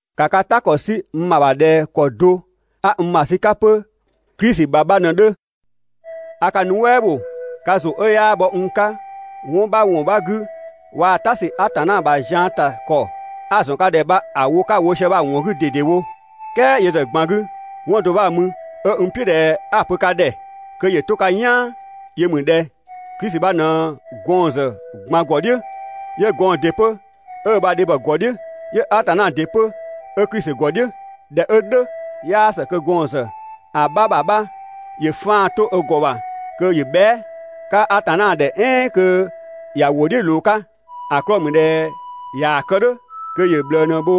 ‑Ka ka "ta ‑kɔ 'sü n ‑bha ‑bha ꞊dhɛ ‑kɔ do 'a n ‑bha ‑sü 'ka 'pö Klisi ‑bha bha ꞊në‑ 'dhö. A ka nuɛ" ‑bho ka ‑zʋ 'ö 'yaa bhɔ n 'ka 'wɔn 'bha ‑wɔn 'bha 'gü waa‑ "ta ‑sü Atanna ‑bha zian ‑ta ‑kɔ 'a‑ ‑zɔn ka ‑dhɛ bha‑ wo 'ka‑ wo sië bha‑ ‑wɔn 'gü ꞊dedewo. "Kɛɛ yö ‑zë ꞊gban 'gü 'wɔn do 'bha‑ mü 'ö n "piʋ̈ ꞊dhɛ 'a‑ pö ka ‑dhɛ kö ‑yö 'to ka "yaan, yö ‑mü ꞊dhɛ: Klisi bha ꞊në gɔɔn‑ ‑zë ꞊gban ‑gɔ "dhiʋ̈, 'yö gɔɔn‑ ‑dɩ 'pö 'ö ö ‑bha dhebhɔ ‑gɔ "dhiʋ̈, 'yö Atanna ‑dɩ 'pö 'ö Klisi ‑gɔ "dhiʋ̈. ꞊Dhɛ 'ö "dhʋ̈, 'yaa ‑së kö gɔɔn‑ ‑zë ‑a 'bha ‑bha 'bha ‑yö 'faan‑ 'to ö ‑gɔ ‑bha kö ‑yö bhɛa"‑ 'ka Atanna ‑dhɛ "ɛɛn kö ‑ya ‑wʋ "dhiʋ̈ ꞊loo‑ 'ka. ‑A 'klɔɔ‑ ‑mü ꞊dhɛ ꞊yaa‑ kë "dhʋ̈ kö ‑yö ꞊bhlëë ꞊në‑ bho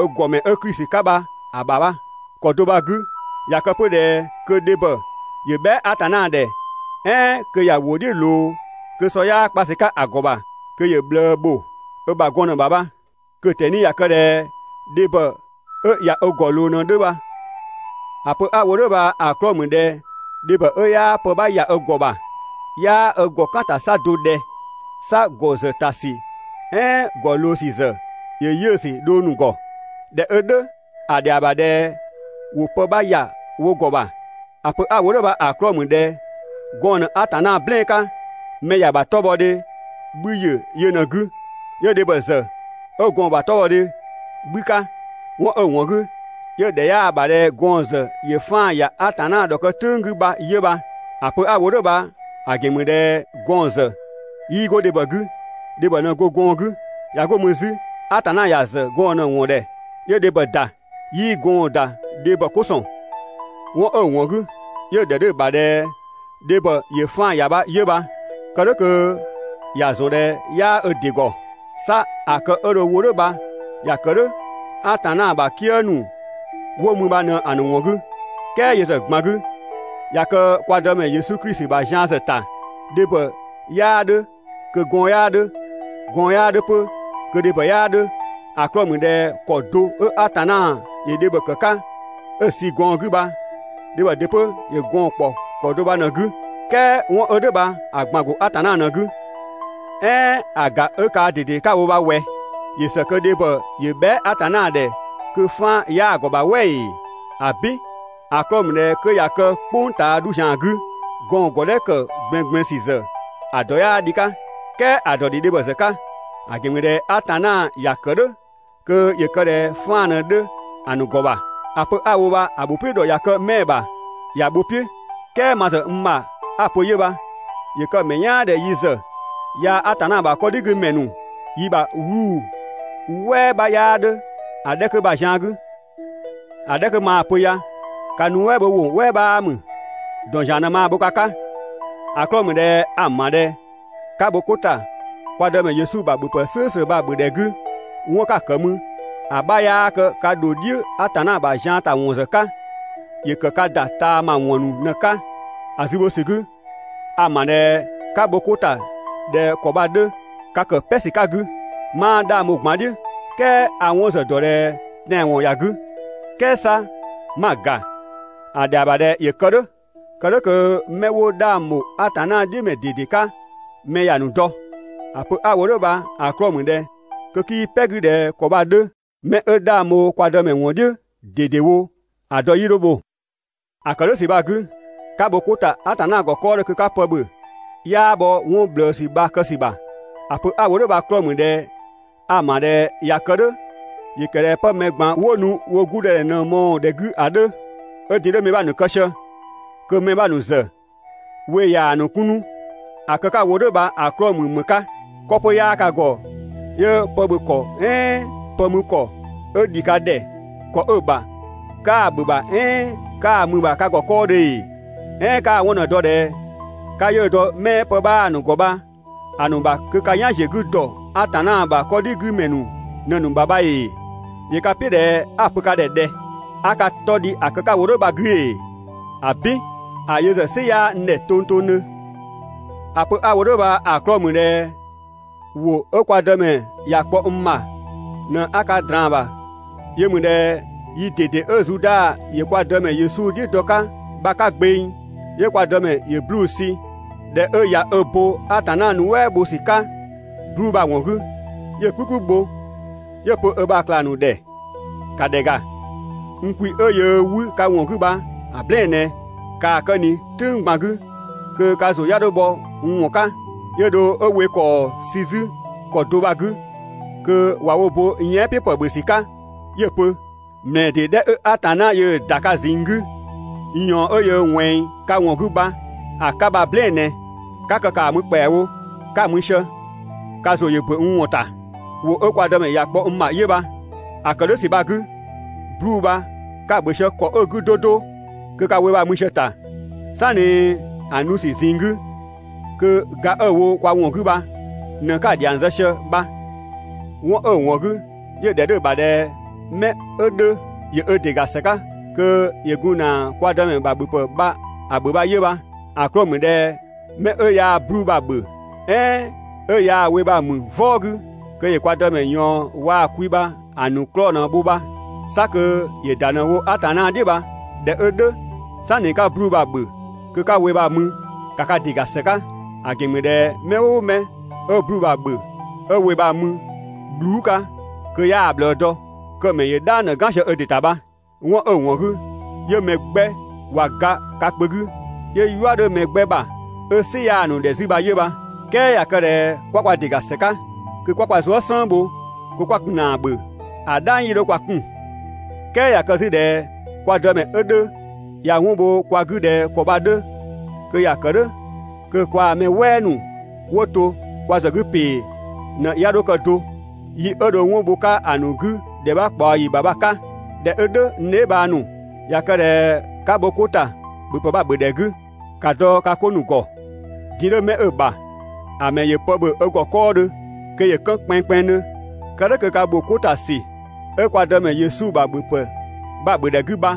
ö ‑gɔmɛ 'ö Klisi 'ka bha‑ ‑bha bha. ‑Kɔ do bha‑ 'gü, ꞊ya kë 'pö ꞊dhɛ kö dhebhɔ ‑yö bhɛa" Atanna ‑dhɛ "ɛɛn kö ‑ya ‑wʋ "dhiʋ̈ ꞊loo kö sɔ 'yaa kpa ‑sü 'ka‑ ‑gɔ ‑bha, kö ‑yö ꞊bhlëë ‑bho ö ‑bha gɔn ꞊në‑ ‑bha bha. Kö‑ ꞊tɛni ꞊ya kë ꞊dhɛ dhebhɔ 'ö ꞊ya ö ‑gɔ ꞊loo ꞊në‑ 'dhö bha. ‑A pö 'a‑ wo "dhʋ̈ bha‑ 'klɔɔ‑ ‑mü ꞊dhɛ dhebhɔ 'ö 'yaa pë 'bha ‑ya ö ‑gɔ ‑bha, 'yaa ö ‑gɔ kaan‑ ‑ta 'sa do ꞊dhɛ? 'Sa ‑gɔ ‑zë ‑ta ‑sü "ɛɛn ‑gɔ ꞊loo ‑sü ‑zë ‑yö 'yiʋ̈‑ ‑sü dhong ‑nu ‑gɔ. ꞊Dhɛ 'ö "dhʋ̈ ‑a ‑dhɛa ‑bha ꞊dhɛ ‑wo pë 'bha ‑ya wo ‑gɔ ‑bha. ‑A pö 'a‑ wo "dhʋ̈ bha‑ 'klɔɔ‑ ‑mü ꞊dhɛ gɔɔn‑ ꞊në Atanna "blɛɛn‑ 'ka, mɛ ‑ya ‑bha 'tɔbhɔdhe 'bhü ‑yö yö ꞊në‑ 'gü. 'Yö dhebhɔ ‑zë 'ö gɔɔn‑ ‑bha 'tɔbhɔdhe 'bhü 'ka. 'Wɔn 'ö‑ ‑wɔn 'gü 'yö‑ ‑dhɛ 'yaa‑ ‑bha ꞊dhɛ gɔɔn‑ ‑zë ‑yö 'faan‑ ‑ya (Atanna ‑dhɔkë "tʋ̈ng 'gü) bha 'yö bha. ‑A pö 'a‑ wo "dhʋ̈ bha‑ ‑gɛn ‑mü ꞊dhɛ gɔɔn‑ ‑zë 'yii 'go dhebhɔ 'gü, dhebhɔ ꞊në go gɔɔn‑ 'gü. ꞊Ya 'go mü 'zü, Atanna ‑ya ‑zë gɔɔn‑ ꞊në‑ ‑wɔn ‑dhɛ 'yö dhebhɔ ‑da, 'yii gɔɔn‑ ‑da dhebhɔ 'ko ‑sɔn. 'Wɔn 'ö‑ ‑wɔn 'gü 'yö‑ ‑dhɛ 'dhö‑ ‑bha ꞊dhɛ dhebhɔ ‑yö 'faan‑ ‑ya bha 'yö bha, kë "dhʋ̈ kö ‑ya ‑zɔn ꞊dhɛ 'yaa ö ‑dɩ ‑gɔ. 'Sa ‑a kë 'ö dho‑ wo "dhʋ̈ bha ‑ya ‑kë "dhʋ̈ Atanna ‑bha "kië ‑nu 'wo mü bha ꞊në‑ ‑nu ‑wɔn 'gü. "Kɛɛ yö ‑zë ꞊gban 'gü, ꞊ya kë kwa Dëmɛ Yesu Klisi ‑bha zian ‑zë ‑ta, dhebhɔ 'yaa 'dhö kö gɔɔn‑ 'yaa 'dhö, gɔɔn‑ 'yaa 'dhö 'pö kö dhebhɔ 'yaa 'dhö. ‑A 'klɔɔ‑ ‑mü ꞊dhɛ ‑kɔ do 'ö Atanna ‑yö dhebhɔ ‑kë 'ka 'ö‑ sü gɔɔn‑ 'gü bha dhebhɔ ‑dɩ 'pö ‑yö gɔɔn‑ ‑kpɔ ‑kɔ do bha ꞊në‑ 'gü, "kɛɛ 'wɔn 'ö "dhʋ̈ bha‑ ꞊gban‑ ‑go Atanna ꞊në‑ 'gü. "Ɛɛn ‑a ‑ga 'ö kaa ꞊dede 'ka‑ wo bha ꞊wɛ, ‑yö ‑së kö dhebhɔ ‑yö bhɛa" Atanna ‑dhɛ kö 'faan‑ 'yaa‑ ‑gɔ ‑bha "wɛ ‑ee? ‑Abin! ‑A 'klɔɔ‑ ‑mü ꞊dhɛ 'kö ꞊ya kë "kpʋng ꞊taa 'dhu ‑zian 'gü, gɔɔn‑ ‑gɔdhɛ ‑kë ꞊gblɛɛngblɛɛn ‑sü ‑zë ‑dɔ 'yaa dhi‑ 'ka. "Kɛɛ ‑a ‑dɔ ‑dhi dhebhɔ ‑zë 'ka, ‑a ‑gɛn ‑mü ꞊dhɛ Atanna ‑ya ‑kë "dhʋ̈ kö ‑yö kë ꞊dhɛ 'faan‑ ꞊në‑ 'dhö ‑a ‑nu ‑gɔ ‑bha. ‑A pö 'a‑ wo bha‑ ‑bho "piʋ̈ ‑dhɔ ꞊ya kë 'mɛɛ‑ ‑bha, ‑ya bho‑ "piʋ̈ "kɛɛ ma ‑zë n ‑bha 'a‑ pö yö bha. ‑Yö kë‑ ‑mɛ "yaan ꞊dhɛ yi ‑zë yaa‑ Atanna ‑bha 'kɔdhigümɛ ‑nu yi ‑bha 'wluu‑ "wɛɛ 'bha 'yaa 'dhö ‑a 'dhɛ 'kö bha‑ zian 'gü. ‑A 'dhɛ 'kö maa‑ pö ya ka nuɛ" bho ‑wʋ "wɛɛ 'bhaa ‑mü. ‑Dɔn ‑zian ꞊në maa‑ bho ka 'ka. ‑A 'klɔɔ‑ ‑mü ꞊dhɛ a‑ ‑ma ꞊dhɛ 'ka bho 'ko ‑ta kwa Dëmɛ Yesu ‑bha ‑bhöpë "slʋ̈ bha‑ ‑bhö ‑dhɛ 'gü, 'wɔn 'ka‑ ‑kë mü ‑a 'bha 'yaa kë ka ‑dho "dhiʋ̈ ‑a ‑bha zian ‑ta ‑wɔn ‑zë 'ka, ‑yö ‑kë ka ‑da ꞊taama ‑wɔn ‑nu ꞊në‑ 'ka. ‑A zü bho ‑sü 'gü, a‑ ‑ma ꞊dhɛ 'ka bho 'ko ‑ta ꞊dhɛ ‑kɔ bha‑ 'dhö, ka ‑kë "pɛ ‑sü 'ka‑ 'gü. 'Maa 'dhang bho‑ ꞊gban "dhiʋ̈ "kɛɛ a‑ 'wɔn ‑zë ‑dɔ ꞊dhɛ tɛanwɔn ‑ya 'gü, "kɛɛ 'sa 'ma‑ ‑ga, ‑a ‑dhɛa ‑bha ꞊dhɛ ‑yö kë "dhʋ̈, kë "dhʋ̈ kö 'mɛ 'wo 'dhang ‑bho Atanna "dhiʋ̈ ‑mɛ ꞊dede 'ka mɛ ‑ya ‑nu dɔ. ‑A pö 'a‑ wo "dhʋ̈ bha‑ 'klɔɔ‑ ‑mü ꞊dhɛ kö 'kii "pɛ‑ 'gü ꞊dhɛ ‑kɔ bha‑ 'dhö, 'mɛ 'ö 'dhang bho kwa Dëmɛ ‑wɔn "dhiʋ̈ ꞊dedewo ‑a dɔ 'yii 'dho bho. ‑A ‑kë "dhʋ̈ ‑sü bha‑ 'gü, 'ka bho 'ko ‑ta Atanna ‑gɔ 'kɔɔdhö kö 'ka pë ‑bhö, 'yaa bhɔ 'wɔn ꞊bhlëësü bha‑ kë ‑sü ‑bha. ‑A pö 'a‑ wo "dhʋ̈ bha‑ 'klɔɔ‑ ‑mü ꞊dhɛ a‑ ‑ma ꞊dhɛ ꞊ya kë "dhʋ̈ ‑yö ‑kë ꞊dhɛ 'pë mɛ ꞊gban 'wo nu wo 'gudɔdhɛ ꞊në‑ mɔɔ‑ ‑dhɛ 'gü ‑a 'dhö, 'ö din‑ 'dhö mɛ 'bha ‑nu kë sië kö mɛ 'bha ‑nu ‑zë we ꞊yaa‑ ‑nu 'kun 'nu. ‑A kë 'ka‑ wo "dhʋ̈ bha‑ 'klɔɔ‑ ‑mü ‑më 'ka? 'Kɔ 'pö 'yaa ka ‑gɔ 'yö pë ‑bhö ‑kɔ "ɛɛn pë mü ‑kɔ 'ö ‑dhi ka ‑dhɛ ‑kɔ 'ö‑ bha 'kaa‑ ‑bhö ‑bha "ɛɛn 'kaa‑ mü‑ ‑bha ka ‑gɔ 'kɔɔdhö ‑ee? "Ɛɛn 'kaa‑ 'wɔn ꞊në‑ dɔ ꞊dhɛ 'ka 'yiʋ̈‑ dɔ 'mɛɛ pë 'bhaa‑ ‑nu ‑gɔ bha‑ ‑nu ‑bha kö ka "yan ‑ziö 'gü ‑dɔ Atanna ‑bha 'kɔdhigümɛ ‑nu ꞊në‑ ‑nu ‑bha bha ‑ee? ‑Yö ka "piʋ̈ ꞊dhɛ 'a‑ pö ka ‑dhɛ ꞊dhɛ? 'A ka 'tɔ dhi ‑a kë 'ka‑ wo "dhʋ̈ bha‑ 'gü ‑ee? ‑Abin! A yö ‑zë "sɩ 'yaa n ‑dhɛ tongtongdhö. ‑A pö 'a‑ wo "dhʋ̈ bha‑ 'klɔɔ‑ ‑mü ꞊dhɛ ‑wʋ 'ö kwa Dëmɛ ‑ya kpɔ n ‑bha ꞊në 'a ka ꞊draan‑ ‑bha. Yö ‑mü ꞊dhɛ yi ꞊dede 'ö Zuda ‑yö kwa Dëmɛ Yesu "dhiʋ̈ dɔ‑ 'ka bha‑ 'ka gbeng, 'yö kwa Dëmɛ ‑yö 'bluu‑ sü. ꞊Dhɛ 'ö ꞊ya ö bo Atanna nuɛ" bho ‑sü 'ka 'bluu‑ bha‑ ‑wɔn 'gü, 'yö‑ "kplükplü bho, 'yö‑ pö ö ‑bha ꞊klang ‑nu ‑dhɛ: «‑Ka ‑dhɛ ‑ga, n kwi 'ö yöö 'wü ka ‑wɔn 'gü bha‑ "blɛɛn‑ ꞊nɛ. ‑Kaa kë ꞊ni "tʋ̈ng ꞊gban 'gü kö ka ‑zʋ 'ya 'dho bhɔ n ‑wɔn 'ka.» 'Yö dho 'ö we ‑kɔɔ sü 'zü ‑kɔ do bha‑ 'gü kö ꞊wa wo bo yɛan" "piʋ̈ ‑pë ‑bhö ‑sü 'ka 'yö‑ pö: «‑Mlɛɛ ‑dee 'dhɛ 'ö Atanna yöö‑ ‑da ka ꞊zinng 'gü n ꞊yɔɔn 'ö yöö ꞊wɛnng ka ‑wɔn 'gü bha‑ 'ka bha‑ "blɛɛn‑ ꞊nɛ. ('Ka kë ‑kaa mü ‑kpɛawo,) 'ka‑ mü sië, ka ‑zʋ ‑yö ‑bö n ‑wɔn ‑ta.» ‑Wʋ 'ö kwa Dëmɛ ‑ya kpɔ n ‑bha 'yö bha. ‑A kë "dhʋ̈ ‑sü bha‑ 'gü, 'bluu‑ bha 'ka‑ ‑bhö sië ‑kɔ 'ö‑ 'gü 'do 'do, kö ka we bha‑ mü sië‑ ‑ta, "sanni ‑a nu ‑sü ꞊zinng 'gü, kö ga 'ö‑ wo kwa ‑wɔn 'gü bha ꞊në 'ka‑ ‑dhiang zë sië bha. ('Wɔn 'ö‑ ‑wɔn 'gü 'yö‑ ‑dhɛ 'dhö ‑bha ꞊dhɛ 'mɛ 'ö 'dhö ‑yö ö ‑dɩ ‑ga ‑së 'ka kö ‑yö gun ‑na kwa Dëmɛ ‑bha ‑bhöpë bha‑ ‑bhö bha 'yö bha.) ‑A 'klɔɔ‑ ‑mü ꞊dhɛ 'mɛ 'ö yaa‑ 'bluu‑ bha‑ ‑bhö "ɛɛn 'ö yaa‑ we bha‑ ‑mü "vɔɔ 'gü, kö ‑yö kwa Dëmɛ ꞊yɔɔn waa‑ kwi bha‑ ‑nu 'klɔɔ‑ ꞊në‑ bho bha, 'sa kö ‑yö ‑da ꞊në‑ wo Atanna "dhiʋ̈ bha. ꞊Dhɛ 'ö "dhʋ̈, "sanni 'ka 'bluu‑ bha‑ ‑bhö kö 'ka‑ we bha‑ mü, ‑ka ka ‑dɩ ‑ga ‑së 'ka. ‑A ‑gɛn ‑mü ꞊dhɛ mɛ "ʋʋ mɛ 'ö‑ 'bluu‑ bha‑ ‑bhö 'ö‑ we bha‑ mü bhluu" 'ka kö 'yaa‑ ꞊bhlëë dɔ, kö‑ ‑mɛ ‑yö "dhang ꞊në "gan sië ö ‑dɩ ‑ta bha. 'Wɔn 'ö‑ ‑wɔn 'gü 'yö mɛ 'gbɛ ꞊wa ga ka kpö 'gü, 'yö "yua 'dhö mɛ 'gbɛ ‑bha 'ö "sɩ 'yaa‑ ‑nu ‑dhɛ 'zü bha 'yö bha. "Kɛɛ ꞊ya kë ꞊dhɛ 'kwa kwa ‑dɩ ‑ga ‑së 'ka, kö 'kwa kwa zuë" "slën bho kö 'kwa gun ‑na ‑a ‑bhö, ‑a "dhang 'yii 'dho kwa 'kun. "Kɛɛ ꞊ya kë 'zü ꞊dhɛ kwa Dëmɛ 'ö 'dhö ꞊ya 'wɔn bho kwa 'gü ꞊dhɛ ‑kɔ bha‑ 'dhö, kö ‑ya ‑kë "dhʋ̈ kö kwaa‑ mɛ "wɛɛ ‑nu 'wo to kwa ‑zë 'gü ‑pee ꞊në 'ya 'dho kë do, yi 'ö dho 'wɔn bho‑ 'ka ‑a ‑nu 'gü ‑dhɛ 'bha ꞊kpaɔ ‑yi ‑bha bha‑ 'ka. ꞊Dhɛ 'ö "dhʋ̈ n dheebhang ‑nu, ꞊ya kë ꞊dhɛ 'ka bho 'ko ‑ta ‑bhöpë bha‑ ‑bhö ‑dhɛ 'gü, ‑ka dɔ ka 'ko ‑nu ‑gɔ. Din‑ 'dhö 'mɛ 'ö‑ ‑bha, ‑a ‑mɛ ‑yö pë ‑bhö ö ‑gɔ 'kɔɔdhö kö ‑yö 'kën kpɛnngkpɛnngdhö, kë "dhʋ̈ kö ka ‑bho 'ko ‑ta ‑sü 'ö kwa Dëmɛ Yesu ‑bha ‑bhöpë bha‑ ‑bhö ‑dhɛ 'gü bha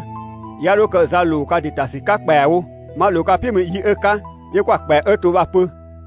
'ya 'dho kë za ‑loo ka ‑dɩ ‑ta ‑sü 'ka ‑kpɛawo. 'Ma ꞊loo ka "piʋ̈ mü yi 'ö‑ 'ka 'yö 'kwa‑ ‑kpɛa 'ö to bha‑ pö.